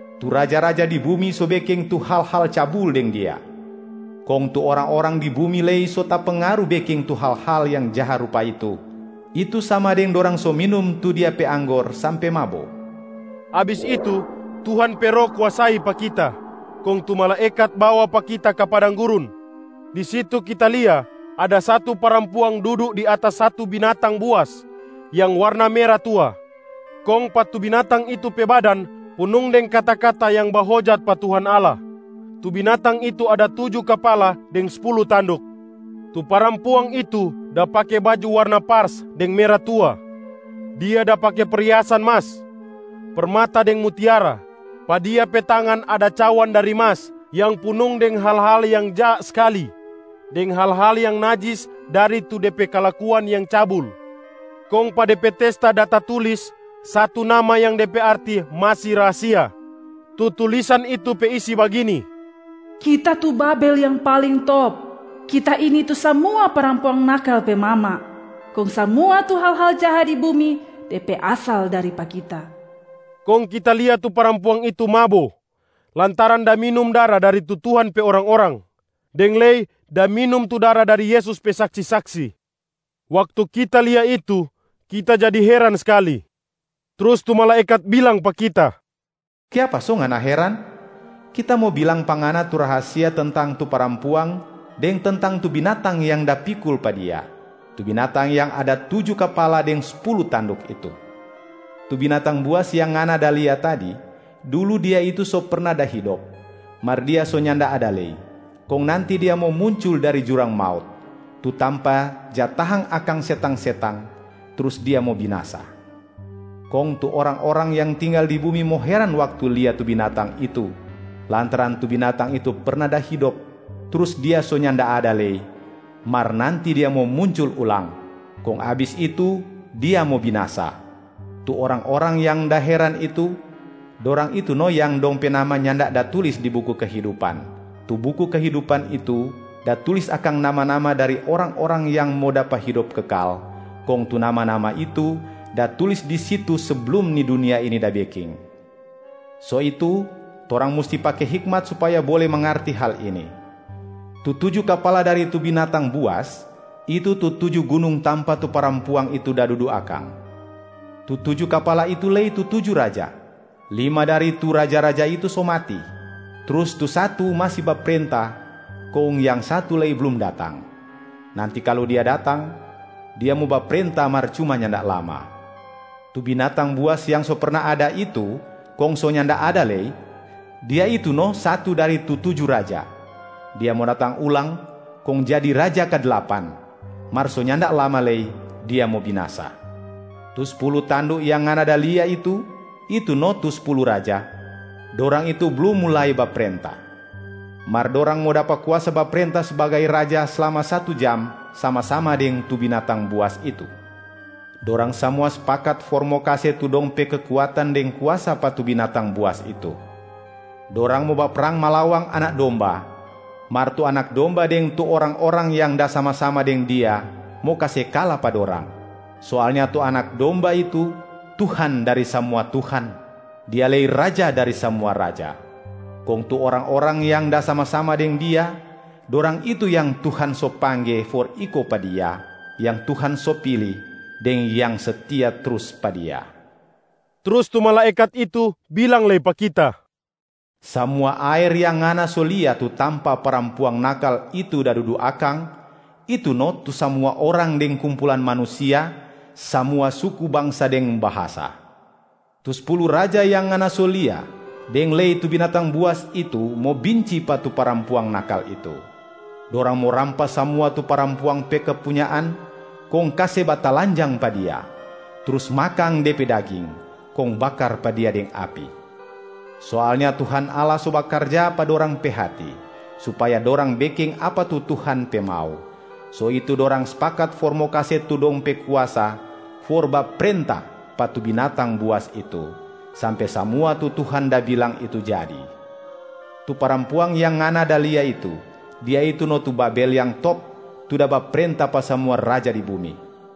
Tu raja-raja di bumi so beking tu hal-hal cabul deng dia. Kong tu orang-orang di bumi lei so tapengaru beking tu hal-hal yang jaha rupa itu, itu sama deng dorang so minum tu dia pe anggor sampe mabo.” Abis itu, Tuhan pe Roh kuasai pa kita kong tu malaekat bawa pa kita ka padang gurun. Di situ kita lia ada satu parampuang dudu di atas satu binatang buas yang warna mera tua, kong pa tu binatang itu pe badan punung deng kata-kata yang bahojat pa Tuhan Allah. Tu binatang itu ada tuju kapala deng spulu tanduk. Tu parampuang itu da pake baju warna pars deng mera tua. Dia da pake perhiasan mas, permata deng mutiara. Pa dia pe tangan ada cawan dari mas yang punung deng hal-hal yang jaha skali deng hal-hal yang najis dari tu de pe kalakuan yang cabul. Kong pa de pe testa da tatulis satu nama yang de pe arti masi rahasia. Tu tulisan itu pe isi bagini, “Kita tu Babel yang paling top! Kita ini tu samua parampuang nakal pe mama, kong samua tu hal-hal jaha di bumi, de pe asal dari pa kita.” Kong kita lia tu parampuang itu mabo lantaran da minum dara dari tu Tuhan pe orang-orang, deng lei da minum tu dara dari Yesus pe saksi-saksi. Waktu kita lia itu, kita jadi heran skali. Trus tu malaekat bilang pa kita, “Kiapa so ngana heran? Kita mo bilang pa ngana tu rahasia tentang tu parampuang deng tentang tu binatang yang da pikul pa dia, tu binatang yang ada tuju kapala deng spulu tanduk itu. Tu binatang buas yang ngana da lia tadi, dulu dia itu so perna da hidop, mar dia so nyanda ada lei, kong nanti dia mo muncul dari jurang maut, tu tampa ja tahang akang setang-setang, trus dia mo binasa. Kong tu orang-orang yang tinggal di bumi mo heran waktu lia tu binatang itu, lantaran tu binatang itu perna da hidop, trus dia so nyanda ada lei, mar nanti dia mo muncul ulang, kong abis itu dia mo binasa. Tu orang-orang yang da heran itu, dorang itu no yang dong pe nama nyanda da tulis di buku kehidupan. Tu buku kehidupan itu da tulis akang nama-nama dari orang-orang yang mo dapa hidop kekal, kong tu nama-nama itu da tulis di situ seblum ni dunia ini da beking. So itu torang musti pake hikmat supaya bole mangarti hal ini: tu tuju kapala dari tu binatang buas, itu tu tuju gunung tampa tu parampuang itu da dudu akang. Tu tuju kapala itu lei tu tuju raja. Lima dari tu raja-raja itu so mati, trus tu satu masi baprenta kong yang satu lei blum datang. Nanti kalu dia datang, dia mo baprenta mar cuma nyanda lama. Tu binatang buas yang so perna ada itu kong so nyanda ada lei, dia itu no satu dari tu tuju raja. Dia mo datang ulang kong jadi raja kadlapan, mar so nyanda lama lei dia mo binasa. Tu spulu tanduk yang ngana da lia itu, itu no tu spulu raja. Dorang itu blum mulai baprenta, mar dorang mo dapa kuasa baprenta sbagai raja slama satu jam sama-sama deng tu binatang buas itu. Dorang samua spakat for mo kase tu dong pe kekuatan deng kuasa pa tu binatang buas itu. Dorang mo baprang malawang Anak Domba, mar tu Anak Domba deng tu orang-orang yang da sama-sama deng Dia mo kase kala pa dorang. Soalnya tu Anak Domba itu Tuhan dari samua tuhan, Dia lei Raja dari samua raja. Kong tu orang-orang yang da sama-sama deng Dia, dorang itu yang Tuhan so pangge for iko pa Dia, yang Tuhan so pili, deng yang setia trus pa Dia.” Trus tu malaekat itu bilang lei pa kita, “Samua aer yang ngana so lia, tu tampa parampuang nakal itu da dudu akang, itu no tu samua orang deng kumpulan manusia, samua suku bangsa deng bahasa. Tu spulu raja yang ngana so lia deng lei tu binatang buas itu mo binci pa tu parampuang nakal itu. Dorang mo rampas samua tu parampuang pe kepunyaan kong kase batalanjang pa dia, trus makang de pe daging, kong bakar pa dia deng api. Soalnya Tuhan Allah so bakarja pa dorang pe hati supaya dorang beking apa tu Tuhan pe mau, so itu dorang spakat for mo kase tu dong pe kuasa for baprenta pa tu binatang buas itu, sampe samua tu Tuhan da bilang itu jadi. Tu parampuang yang ngana da lia itu, dia itu no tu Babel yang top tu da baprenta pa samua raja di bumi.”